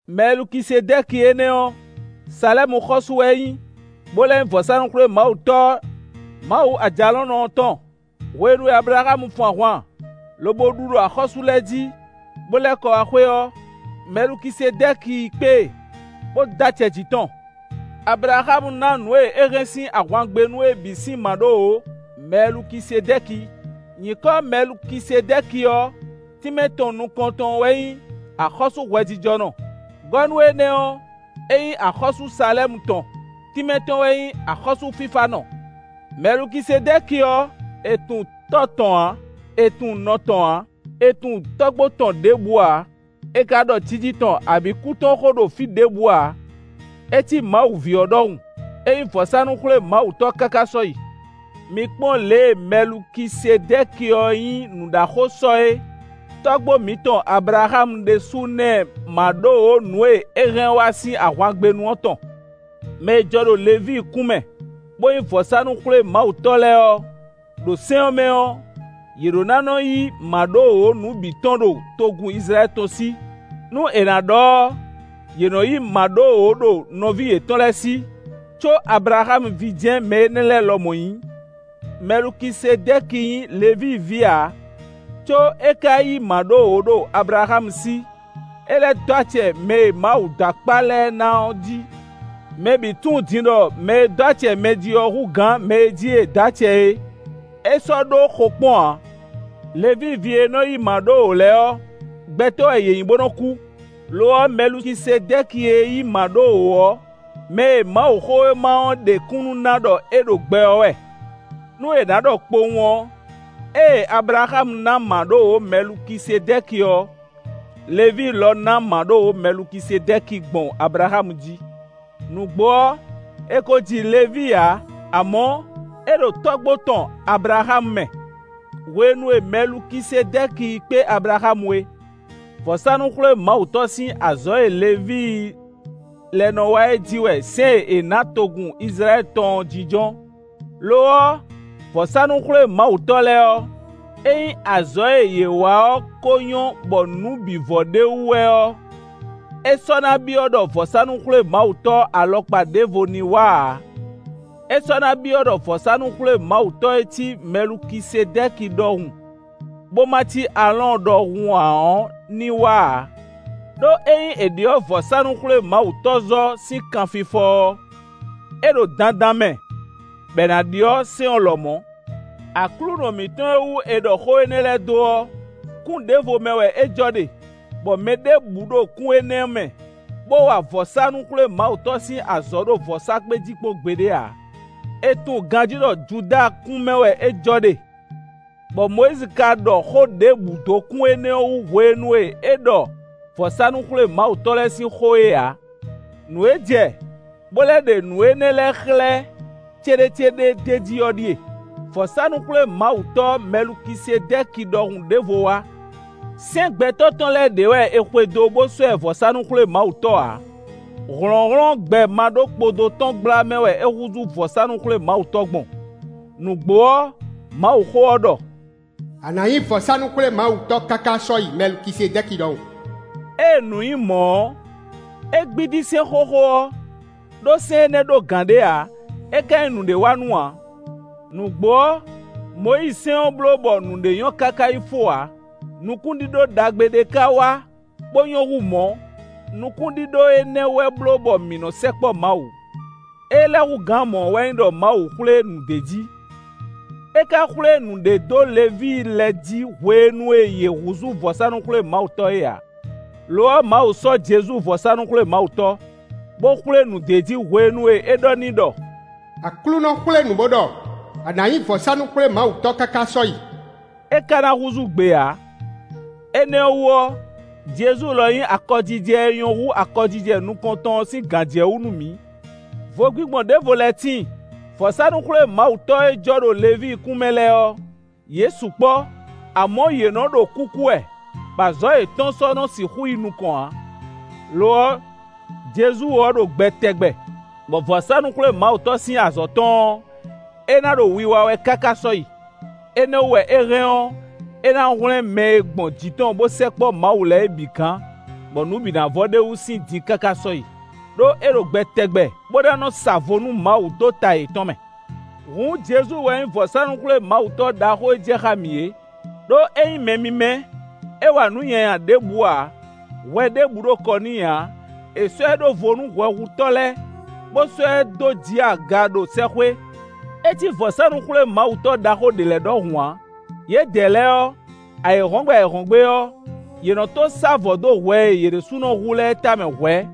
Mɛlukisedɛ́ki énɛ́ ɔ́, Salɛ́mu xɔ́sú wɛ é nyí, bó lɛ́ nyí vɔ̌sánú-xwlémawutɔ́ Mawu Ajalɔ̌nlɔn ɔ́ tɔn. Hwenu e Ablaxámu fun ahwan lobo ɖu ɖo axɔ́sú lɛ́ɛ jí, bó lɛ́ kɔ wá xwé ɔ́, Mɛlukisedɛ́ki yi kpé e, bó dó acɛ jǐ tɔn. Ablaxámu ná nǔ e é hɛn sín ahwangbénu é bǐ sín mǎɖówǒ Mɛlukisedɛ́ki. Nyǐkɔ Mɛlukisedɛ́ki ɔ́, tínmɛ tɔn nukɔntɔn ɔ́ wɛ nyí “Axɔ́sú hwɛjijɔnɔ”. Gɔ́ nú énɛ́ ɔ́, é nyí axɔ́sú Salɛ́mu tɔn; tínmɛ tɔn wɛ nyí: “Axɔ́sú fífánɔ”. Mɛlukisedɛ́ki ɔ́, è tunwun tɔ́ tɔn ǎ, è tunwun nɔ tɔn ǎ; è tunwun tɔ́gbó tɔn ɖěbǔ ǎ; è ka ɖɔ jiji tɔn abǐ kú tɔn xó ɖo fí ɖěbǔ ǎ; é cí Mawu ví ɔ́ ɖɔhun; é nyí vɔ̌sánú-xwlémawutɔ́ káká sɔ́yi. Mi kpɔ́n lě e Mɛlukisedɛ́ki ɔ́ nyí nǔɖaxó sɔ é! Tɔ́gbó mǐtɔn Ablaxámu ɖésú ná ɛ mǎɖówǒ nǔ e é hɛn wá sín ahwangbénu ɔ́ tɔn. Mɛ e jɔ ɖo Levíi kún mɛ, bó nyí vɔ̌sánú-xwlémawutɔ́ lɛ́ɛ ɔ́, ɖo sɛ́n ɔ́ mɛ ɔ́, yě ɖó ná nɔ yí mǎɖówǒ nǔ bǐ tɔn ɖo togun Izlayɛ́li tɔn sí. Nú è nǎ ɖɔ ɔ́, yě nɔ yí mǎɖówǒ ɖo nɔví yětɔn lɛ́ɛ sí, có Ablaxámu ví jɛ́n mɛ énɛ́ lɛ́ɛ lɔmɔ̌ nyí. Mɛlukisedɛ́ki nyí Levíi ví ǎ, có é ka yí mǎɖówǒ ɖo Ablaxámu sí; é lɛ́ dó acɛ mɛ e Mawu dó akpá lɛ́ɛ ná ɔ́ jí. Mɛ bǐ tunwun din ɖɔ mɛ e dó acɛ mɛ jí ɔ́ hú gǎn mɛ e jí è dǒ acɛ é; é sɔ́ ɖó xokpɔ́n ǎ. Levíi ví e nɔ yí mǎɖówǒ lɛ́ɛ ɔ́, gbɛtɔ́ wɛ yě nyí, bó nɔ kú; lo ɔ́, Mɛlukisedɛ́ki e yí mǎɖówǒ ɔ́, mɛ e Mawuxówéma ɔ́ ɖe kúnnu ná ɖɔ é ɖo gbɛ ɔ́ wɛ. Nú è nǎ ɖɔ kpowun ɔ́, ée Ablaxámu ná mǎɖówǒ Mɛlukisedɛ́ki ɔ́, Levíi lɔ ná mǎɖówǒ Mɛlukisedɛ́ki gbɔn Ablaxámu jí. Nǔgbó ɔ́, è ko ji Levíi ǎ; amɔ̌, é ɖo tɔ́gbó tɔn Ablaxámu mɛ, hwenu e Mɛlukisedɛ́ki yi kpé Ablaxámu é. Vɔ̌sánú-xwlémawutɔ́ sín azɔ̌ e Levíi lɛ́ɛ nɔ wa é jí wɛ sɛ́n e è nǎ togun Izlayɛ́li tɔn ɔ́ jínjɔ́n. Lo ɔ́, vɔ̌sánú-xwlémawutɔ́ lɛ́ɛ ɔ́, ényí azɔ̌ e yě wa ɔ́ ko nyɔ́ bɔ nǔ bǐ vɔ ɖ'é wú wɛ ɔ́, é sɔ́ ná byɔ́ ɖɔ vɔ̌sánú-xwlémawutɔ́ alɔkpa ɖěvo ní wá ǎ; é sɔ́ ná byɔ́ ɖɔ vɔ̌sánú-xwlémawutɔ́ e cí Mɛlukisedɛ́ki ɖɔhun, bó ma cí Aalɔ́ɔn ɖɔhun ǎ ɔ́ ní wá ǎ. Đó ényí è ɖyɔ̌ vɔ̌sánú-xwlémawutɔ́zɔ́ sín kanfifɔ ɔ́, é ɖo dandan mɛ bɔ è nǎ ɖyɔ́ sɛ́n ɔ́ lɔmɔ̌. Aklúnɔ mǐtɔn e wú è ɖɔ xó énɛ́ lɛ́ɛ dó ɔ́, kún ɖěvo mɛ wɛ é jɔ ɖe, bɔ mɛ ɖěbǔ ɖo kún énɛ́ mɛ, bó wa vɔ̌sánú-xwlémawutɔ́ sín azɔ̌ ɖo vɔ̌sákpe jí kpɔ́n gbeɖé ǎ. È tunwun ganjí ɖɔ Judáa kún mɛ wɛ é jɔ ɖe, bɔ Mɔyízi ka ɖɔ xó ɖěbǔ dó kún énɛ́ wú hwenu e é ɖɔ vɔ̌sánú-xwlémawutɔ́ lɛ́ɛ sín xó é ǎ. Nǔ e jɛ bó lɛ́ ɖe nǔ énɛ́ lɛ́ɛ xlɛ́ céɖécéɖé d'é jí ɔ́ ɖíe: vɔ̌sánú-xwlémawutɔ́ Mɛlukisedɛ́ki ɖɔhun ɖěvo wá. Sɛ́n gbɛtɔ́ tɔn lɛ́ɛ ɖě wɛ è xwedó bó sɔ́ ɛ vɔ̌sánú-xwlémawutɔ́ ǎ; hlɔ̌nhlɔ́n gbɛ maɖókpodó tɔn gbla mɛ wɛ é húzú vɔ̌sánú-xwlémawutɔ́ gbɔn. Nǔgbó ɔ́, Mawuxówéma ɔ́ ɖɔ: “A nǎ nyí vɔ̌sánú-xwlémawutɔ́ káká sɔ́yi Mɛlukisedɛ́ki ɖɔhun.” Ée nǔ nyí mɔ̌ ɔ́, é gbídí sɛ́n xóxó ɔ́, ɖó sɛ́n énɛ́ ɖó gǎn ɖé ǎ, é ka nyí nǔɖé wa nú ǎ. Nǔgbó ɔ́, Mɔyízisɛ́n ɔ́ bló bɔ nǔɖé nyɔ́ káká yi fó ǎ; nukúnɖíɖó ɖagbe ɖé ka wá bó nyɔ́ hú mɔ̌; nukúnɖíɖó énɛ́ wɛ bló bɔ mǐ nɔ sɛkpɔ́ Mawu. Ée lɛ́ hú gǎn mɔ̌ ɔ́ wɛ nyí ɖɔ Mawu xwlé nǔ d'é jí. É ka xwlé nǔɖé dó Levíi lɛ́ɛ jí hwenu e yě húzú vɔ̌sánú-xwlémawutɔ́ é ǎ. Lo ɔ́, Mawu sɔ́ Jezu vɔ̌sánú-xwlémawutɔ́, bó xwlé nǔ d'é jí hwenu e é ɖɔ n'i ɖɔ: “Aklúnɔ xwlé nǔ bó ɖɔ: ‘A nǎ nyí vɔ̌sánú-xwlémawutɔ́ káká sɔ́yi.’” É ka ná húzú gbe ǎ. Énɛ́ ɔ́ wú ɔ́, Jezu lɔ nyí akɔjijɛ e nyɔ́ hú akɔjijɛ nukɔntɔn ɔ́ sín gǎnjɛwú nú mǐ. Vogbingbɔn ɖěvo lɛ́ tíin: vɔ̌sánú-xwlémawutɔ́ e jɔ ɖo Levíi kún mɛ lɛ́ɛ ɔ́, yě sukpɔ́; amɔ̌ yě nɔ ɖo kúkú wɛ, bɔ azɔ̌ yětɔn sɔ́ nɔ sixú yi nukɔn ǎ. Lo ɔ́, Jezu ɔ́ ɖo gbɛ tɛgbɛ, bɔ vɔ̌sánú-xwlémawutɔ́ sín azɔ̌ tɔn ɔ́, é ná ɖo wiwa wɛ káká sɔ́yi. Énɛ́ wú wɛ é hɛn ɔ́, é ná hwlɛ́n mɛ e gbɔn jǐ tɔn bó sɛkpɔ́ Mawu lɛ́ɛ é bǐ gǎn, bɔ nǔ bǐ ná vɔ ɖ'é wú sín din káká sɔ́yi, ɖó é ɖo gbɛ tɛgbɛ, bó ná nɔ sa vo nú Mawu dó ta yětɔn mɛ. Hǔn, Jezu wɛ nyí vɔ̌sánú-xwlémawutɔ́ ɖaxó e jɛ xá mǐ é, ɖó é nyí mɛ mímɛ́; é wa nǔ nyanya ɖěbǔ ǎ; hwɛ ɖěbǔ ɖo kɔ n'i ǎ. È sɔ́ ɛ ɖó vo nú hwɛhutɔ́ lɛ́ɛ, bó sɔ́ ɛ dó jǐ aga ɖo sɛ́xwé. É cí vɔ̌sánú-xwlémawutɔ́ ɖaxó ɖě lɛ́ɛ ɖɔhun ǎ: yědɛɛ lɛ́ɛ ɔ́, ayǐhɔ́ngbe ayǐhɔ́ngbe ɔ́, yě nɔ to sá vɔ̌ dó hwɛ e yě ɖésúnɔ hu lɛ́ɛ tamɛ hwɛ̌,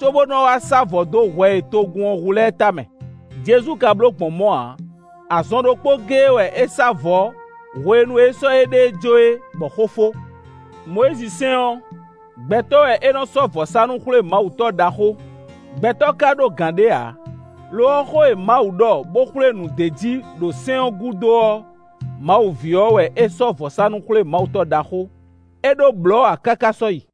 có bó nɔ́ wá sá vɔ̌ dó hwɛ e togun ɔ́ hu lɛ́ɛ tamɛ; Jezu ka bló gbɔn mɔ̌ ǎ. Azɔn ɖokpó géé wɛ é sá vɔ̌ hwenu e é sɔ́ éɖée jó é, bɔ xó fó. Mɔyízisɛ́n ɔ́, gbɛtɔ́ wɛ é nɔ sɔ́ vɔ̌sánú-xwlémawutɔ́ ɖaxó; gbɛtɔ́ ka ɖó gǎn ɖé ǎ; lo ɔ́, xó e Mawu ɖɔ bó xwlé nǔ d'é jí ɖo sɛ́n ɔ́ gúdo ɔ́, Mawu ví ɔ́ wɛ é sɔ́ vɔ̌sánú-xwlémawutɔ́ ɖaxó; é ɖó blɔ̌ ǎ káká sɔ́yi.